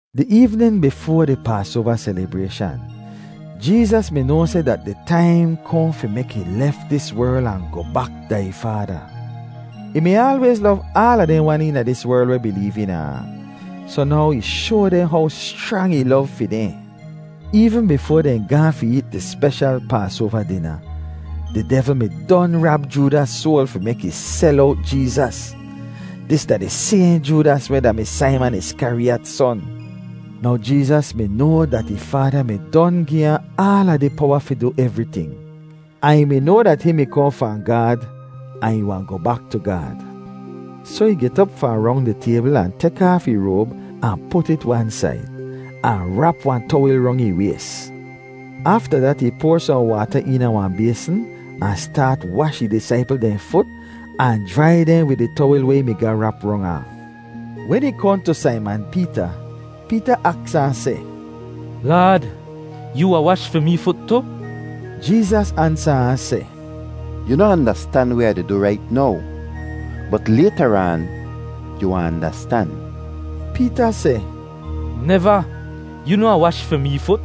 Di eevnin bifoa di Paasoava selibrayshan, Jeezas mi noa seh dat di taim kohn fi mek ih lef dis werl ahn goh bak da ih Faada. Ih mi aalwayz lov aala dehn wan eena dis werl weh bileev eena ahn, soh now ih shoa dehn how schrang ih lov fi dehn. Eevn bifoa dehn gaahn fi eet di speshal Paasoava dina, di devl mi don rab Joodas soal fi mek ih sel owt Jeezas. Dis da di sayhn Joodas weh da-mi Saiman Iskariyat son. Now Jeezas mi noa dat ih Faada mi don gi ahn aala di powa fi du evriting, ahn ih mi noa dat hihn mi kohn fahn Gaad ahn ih wahn goh bak tu Gaad. Soh ih get op fahn rong di taybl ahn tek aaf ih roab ahn put it wan said, ahn rap wahn towil rong ih ways. Afta dat ih poar sohn waata eena wahn baysn ahn staat wash ih disaipl dehn fut ahn jrai dehn wid di towil weh ih mi ga rap rong ahn. Wen ih kohn tu Saiman Peeta, Peeta aks ahn seh, “Laad, yoo wahn wash fi mee fut tu?” Jeezas ansa ahn seh, “Yu noh andastan weh Ah di du rait now, bot laytaraan yu wahn andastan.” Peeta seh, “Neva! Yoo noh wahn wash fi mee fut!”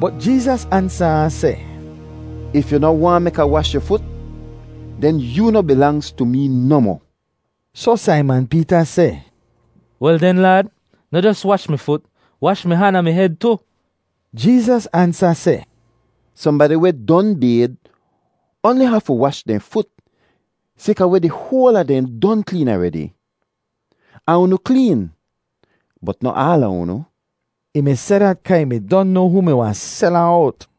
Bot Jeezas ansa ahn seh, “If yu noh waahn mek Ah wash yu fut, den yoo noh bilangz tu mee nohmoh!” Soh Saiman Peeta seh, “Wel den Laad, noh jos wash mi fut, wash mi han ahn mi hed tu!” Jeezas ansa seh, “Sohnbadi weh don bayd oanli hafu wash dehn fut sayka weh di hoal a dehn don kleen aredi. Ahn unu kleen, bot noh aala unu.” Ih mi seh dat, kaa ih mi don noa hoo mi wahn sel ahn owt.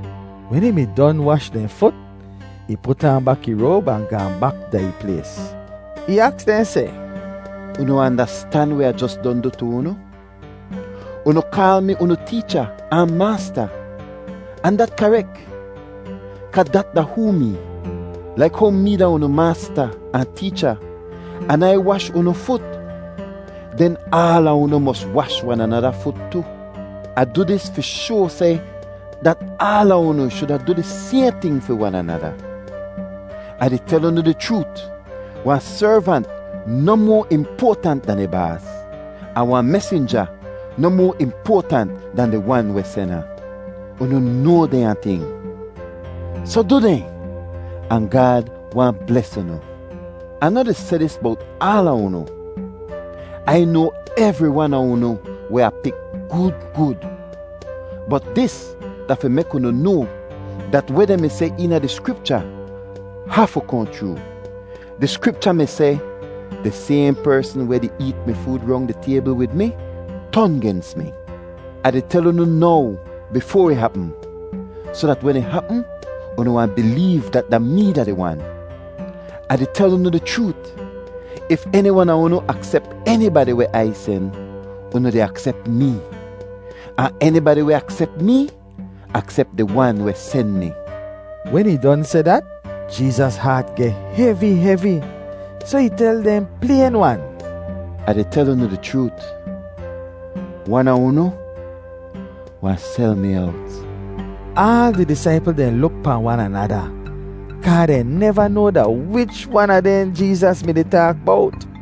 Wen ih mi don wash dehn fut, ih put aan bak ih roab ahn gaahn bak da ih plays. Ih aks dehn seh, “Unu andastan weh Ah jos don du tu unu? Unu kaal mi unu Teecha ahn Maasta ahn dat karek, kaa dat da hoo mee. Laik how mee da unu Maasta ahn Teecha an Ai wash unu fut, den aala unu mos wash wan anada fut tu. Ah du dis fi shoa seh dat aala unu shuda du di sayhn ting fi wan anada. Ah di tel unu di chroot, wahn servant noh moa impoatant dan ih baas, ahn wahn mesinja noh moa impoatant dan di wan weh sen ahn. Unu noa dehnya ting, soh du dehn, ahn Gaad wahn bles unu. “Ah noh di seh dis bowt aala unu; Ai noa evri wan a unu weh Ah pik gud gud. Bot dis da fi mek unu noa dat weh dehn mi seh eena di Skripcha hafu kohn chroo. Di Skripcha mi seh, ‘Di sayhn persn weh di eet mi food rong di taybl wid mi ton gens mi.’ Ah di tel unu now bifoa ih hapm, soh dat wen ih hapm unu wahn bileev dat da mee da di Wan. Ah di tel unu di chroot, if eni wan a unu aksep enibadi weh Ai sen, unu di aksep mee; ahn enibadi weh aksep mee aksep di Wan weh sen mi.” Wen ih don seh dat, Jeezas haat geh hevi hevi, soh ih tel dehn playn-wan, “Ah di tel unu di chroot, wan a unu wahn sel mi owt.” Aal di disaipl dehn luk pahn wan anada, kaa dehn neva noa da wich wan a dehn Jeezas mi-di taak bowt.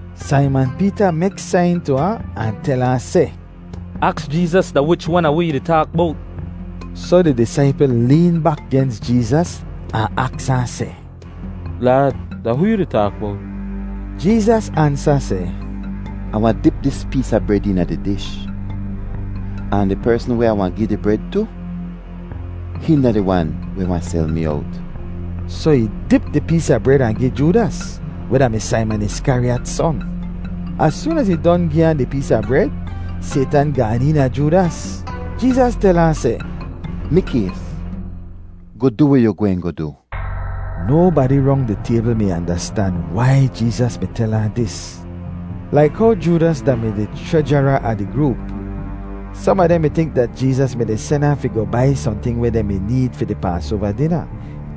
Saiman Peeta mek sain tu ahn, ahn tel ahn seh, “Aks Jeezas da wich wan a wi ih di taak bowt.” Soh di disaipl leen bak gens Jeezas ahn aks ahn seh, “Laad, da hoo yu di taak bowt?” Jeezas ansa seh, “Ah wahn dip dis pees a bred eena di dish, ahn di persn weh Ah wahn gi di bred tu, hihn da di wan weh wahn sel mi owt.” Soh ih dip di pees a bred ahn gi Joodas, weh da-mi Saiman Iskariyat son. Az soon az ih don gi ahn di pees a bred, Saytan gaan eena Joodas. Jeezas tel ahn seh, “Mikays, goh du weh yu gwehn goh du.” Nobadi rong di taybl mi andastan wai Jeezas mi tel ahn dis. Laik how Joodas da-mi di chrejara a di groop, som a dehn mi tink dat Jeezas mi-di sen ahn fi goh bai sohnting weh dehn mi need fi di Paasoava dina,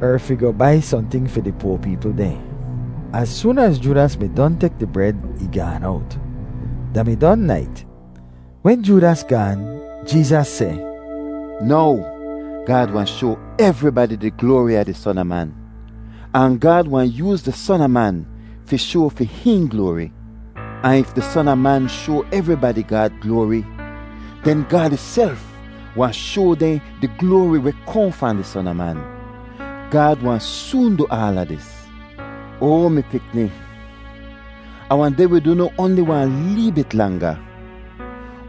er fi goh bai sohnting fi di poa peepl dehn. Az soon az Joodas mi don tek di bred, ih gaan owt. Da mi don nait. Wen Joodas gaan, Jeezas seh, “Now Gaad wahn shoa evribadi di gloari a di Son a Man, ahn Gaad wahn yooz di Son a Man fi shoa fi hihn gloari! Ahn if di Son a Man shoa evribadi Gaad gloari, den Gaad ihself wahn shoa dehn di gloari weh kohn fahn di Son a Man. Gaad wahn soon du aala dis. “Oa mi pikni, Ah wahn deh wid unu oanli wahn lee bit langa.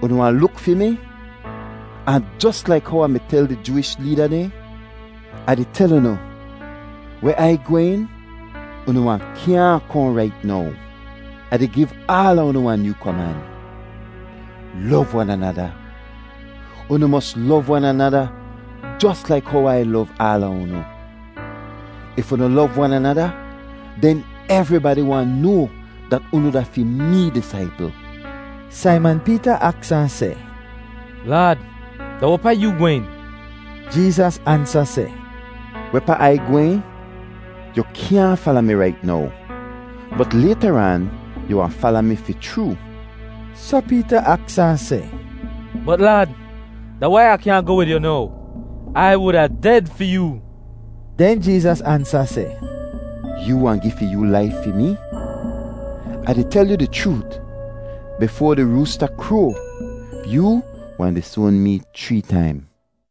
Unu wahn luk fi mi, ahn jos laik how Ah mi tel di Jooish leeda dehn, Ah di tel unu, weh Ai gwehn, unu wahn kyaahn kohn rait now. “Ah di giv aala unu wahn nyoo koman: Lov wan anada. Unu mos lov wan anada jos laik how Ai lov aala unu. If unu lov wan anada, den evribadi wahn noa dat unu da fi mee disaipl.” Saiman Peeta aks ahn seh, “Laad, da wehpaa yu gwehn?” Jeezas ansa seh, “Wehpaa Ai gwehn yu kyaahn fala mi rait now, bot laytaraan yu wahn fala mi fi chroo.” Soh Peeta aks ahn seh, “Bot Laad, da wai Ah kyaahn goh wid yu now? Ai wuda ded fi yoo!” Den Jeezas ansa seh, “Yoo wahn gi fi yoo laif fi mee? Ah di tel yu di chroot, bifoa di roosta kroa, yoo wahn disoan mee chree taim!”